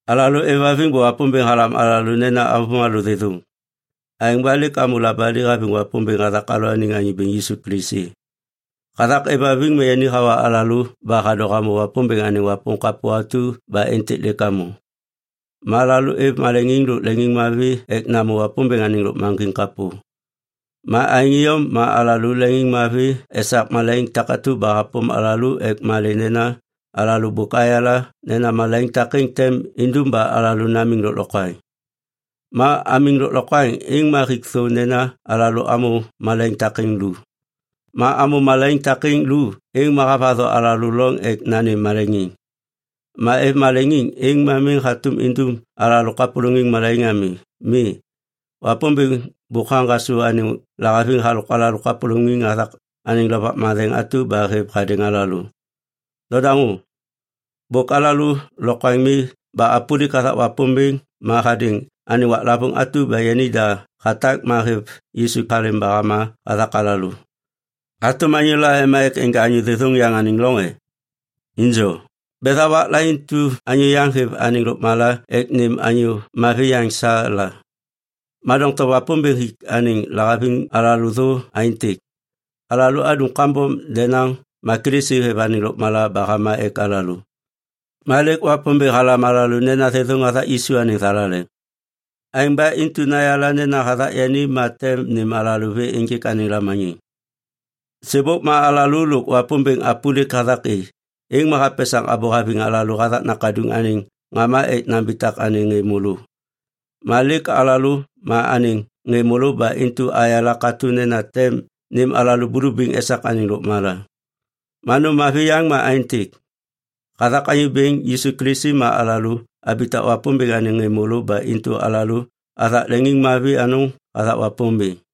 Alalô aêvhaviŋ ba Wapômbêŋ halam alalô nena avômalô thêthôŋ. Aêŋ ba lêk amô labali haviŋ Wapômbêŋ hathak alalôaniŋ Anyô Bêŋ Yisu Kilisi. Hathak aêvhaviŋ ma yani hawa alalô ba hadô hamô Wapômbêŋ anêŋ wapôm kapô atu ba êntêk lêk amô. Ma alalô aêv maleŋiŋ lôk leŋiŋmavi ek namô Wapômbêŋ anêŋ lôkmaŋgiŋ kapô. Ma aêŋ iyom ma alalô leŋiŋmavi esak malaiŋ takatu ba hapôm alalô ek malê nena alalô bôk ayala nena malaiŋ takêŋ tem indum ba alalô namiŋ lôklokwaŋ. Ma amiŋ lôklokwaŋ, êŋ ma hik thô nena alalô amô malaiŋ takêŋ lu. Ma amô malaiŋ takêŋ lu, êŋ ma havatho alalô loŋ ek nanêm maleŋiŋ. Ma aêv maleŋiŋ êŋ miŋ hatôm indum alalô kapôlôŋiŋ malaiŋ ami. Mi, Wapômbêŋ bôk haŋgasô anêŋ lahaviŋ halôk alalô kapôlôŋiŋ hathak anêŋ Lovak Matheŋ atu ba hêv hadêŋ alalô. Nodaŋô. Bôk alalô lokwaŋ mi ba apôlik hathak Wapômbêŋ ma hadêŋ anêŋ waklavôŋ atu ba yanida hatak ma hêv Yisu halêm ba hama hathak alalô. Hatôm anyôla ema ek enja anyô thêthôŋ yaŋ anêŋ loŋ e? Injo, betha wakla intu anyô yaŋ hêv anêŋ lôkmala ek nêm anyô mavi yaŋ sa la. Ma doŋtom Wapômbêŋ hik anêŋ lahaviŋ alalô thô aêntêk. Alalô adum kambom denaŋ ma Kilisi hêv anêŋ lôkmala ba hama ek alalô. Ma lêk Wapômbêŋ halam alalô nena thêthôŋ hathak Yisu anêŋ thalaleŋ. Aêŋ ba intu nayala nena hathak yani ma tem nêm alalô vê ênjêk anêŋ lamaniŋ. Sêbôk ma alalô lôk Wapômbêŋ apôlik hathak i, êŋ ma hapesaŋ abô haviŋ alalô hathak Nakaduŋ anêŋ ŋama ek nambitak anêŋ ŋê môlô. Ma lêk alalô ma anêŋ ŋê môlô ba intu ayala katô nena tem nêm alalô bulubiŋ esak anêŋ lôkmala. Ma nôm mavi yaŋ ma aêntêk. Hathak Anyô Bêŋ Yisu Kilisi ma alalô abitak Wapômbêŋ anêŋ ŋê môlô ba intu alalô athak leŋiŋmavi anôŋ hathak Wapômbêŋ.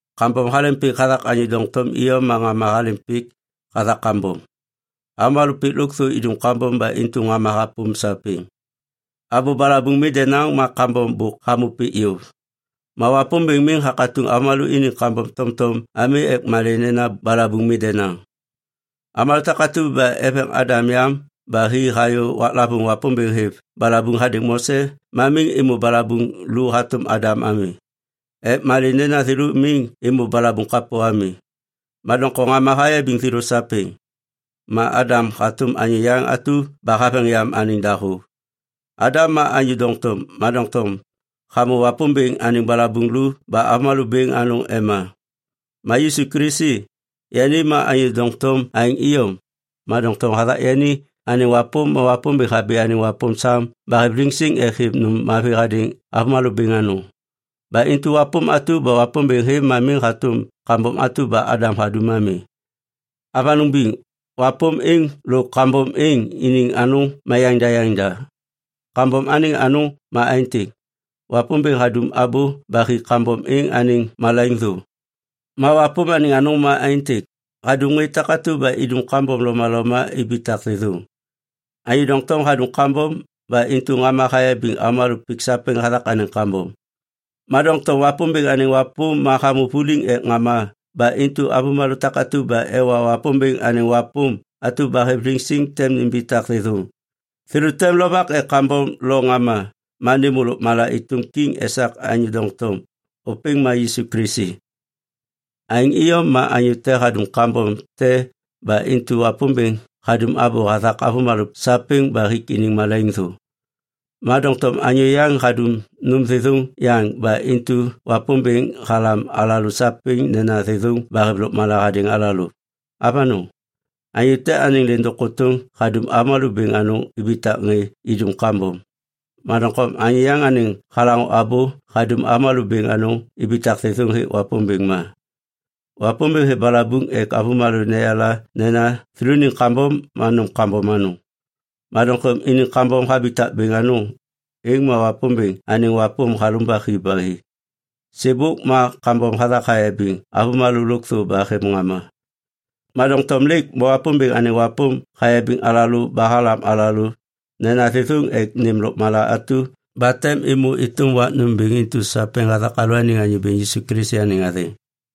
Kambom halêm pik hathak anyô doŋtom iyom ma ŋama halêm pik hathak kambom. Avômalô pik lôkthô idum kambom ba intu ŋama hapôm sapêŋ. Abô balabuŋ mi denaŋ ma kambom bôk hamô pik yôv. Ma Wapômbêŋ miŋ hakatuŋ avômalô iniŋ kambom tomtom ami ek malê nena balabuŋ mi denaŋ. Avômalô takatu ba eveŋ Adam yam ba hi hayô waklavôŋ Wapômbêŋ hêv balabuŋ hadêŋ Mose ma miŋ êmô balabuŋ lu hatôm Adam ami. Ek malê nena thêlô miŋ êmô balabuŋ kapô ami. Ma doŋtom ŋama hayabiŋ thêlô sapêŋ. Ma Adam ma hatôm anyô yaŋ atu ba haveŋ yam anêŋ dahô. Adam ma anyô doŋtom, ma doŋtom hamô Wapômbêŋ anêŋ balabuŋ lu ba avômalô bêŋ anôŋ ema. Ma Yisu Kilisi, yani ma anyô doŋtom aêŋ iyom. Ma doŋtom hathak yani anêŋ wapôm ma Wapômbêŋ habi anêŋ wapôm sam ba hêv liŋsiŋ ek hêv nôm mavi hadêŋ avômalô bêŋ anôŋ. Ba intu wapôm atu ba Wapômbêŋ hêv ma miŋ hatôm kambom atu ba Adam hadum ami. Avanôŋ biŋ, wapôm êŋ lôk kambom êŋ iniŋ anôŋ ma yaŋda yaŋda. Kambom anêŋ anôŋ ma aêntêk, Wapômbêŋ hadum abô ba hik kambom êŋ anêŋ malaiŋ thô. Ma wapôm anêŋ anôŋ ma aêntêk, hadum ŋê takatu ba idum kambom lomaloma ibitak thêthôŋ. Anyô doŋtom hadum kambom ba intu ŋama hayabiŋ avômalô pik sapêŋ hathak anêŋ kambom. Ma doŋtom Wapômbêŋ anêŋ wapôm ma hamô vuliŋ ek ŋama ba intu avômalô takatu ba ewa Wapômbêŋ anêŋ wapôm atu ba hêv liŋsiŋ tem nimbitak thêthôŋ. Thêlô tem lovak ek kambom lo ŋama ma nêmô lôkmala êtôm kiŋ esak anyô doŋtom, ôpêŋ ma Yisu Kilisi. Aêŋ iyom ma anyô te hadum kambom te ba intu Wapômbêŋ hadum abô hathak avômalô sapêŋ ba hik iniŋ malaiŋ thô. Ma doŋtom anyô yaŋ hadum nôm thêthôŋ yaŋ ba intu Wapômbêŋ halam alalô sapêŋ nena thêthôŋ ba hêv lôkmala hadêŋ alalô. Avanôŋ, anyô te anêŋ lêndôŋ kôtôŋ hadum avômalô bêŋ anôŋ ibitak ŋê idum kambom. Ma doŋtom anyô yaŋ anêŋ halaŋô abô hadum avômalô bêŋ anôŋ ibitak thêthôŋ hêk Wapômbêŋ ma. Wapômbêŋ hêv balabuŋ ek avômalô neyala nena thêlôniŋ kambom ma nôm kambom anôŋ. Ma doŋtom iniŋ kambom habitak bêŋ anôŋ, êŋ ma Wapômbêŋ anêŋ wapôm halumbak hi ba hi. Sêbôk ma kambom hathak hayabiŋ avômalô lôkthô ba hêv ŋama. Ma doŋtom lêk ma Wapômbêŋ anêŋ wapôm hayabiŋ alalô ba halam alalô nena thêthôŋ ek nêm lôkmala atu ba tem êmô êtôm wak nômbêŋ intu sapêŋ hathak alalôaniŋ Anyô Bêŋ Yisu Kilisi anêŋ athêŋ.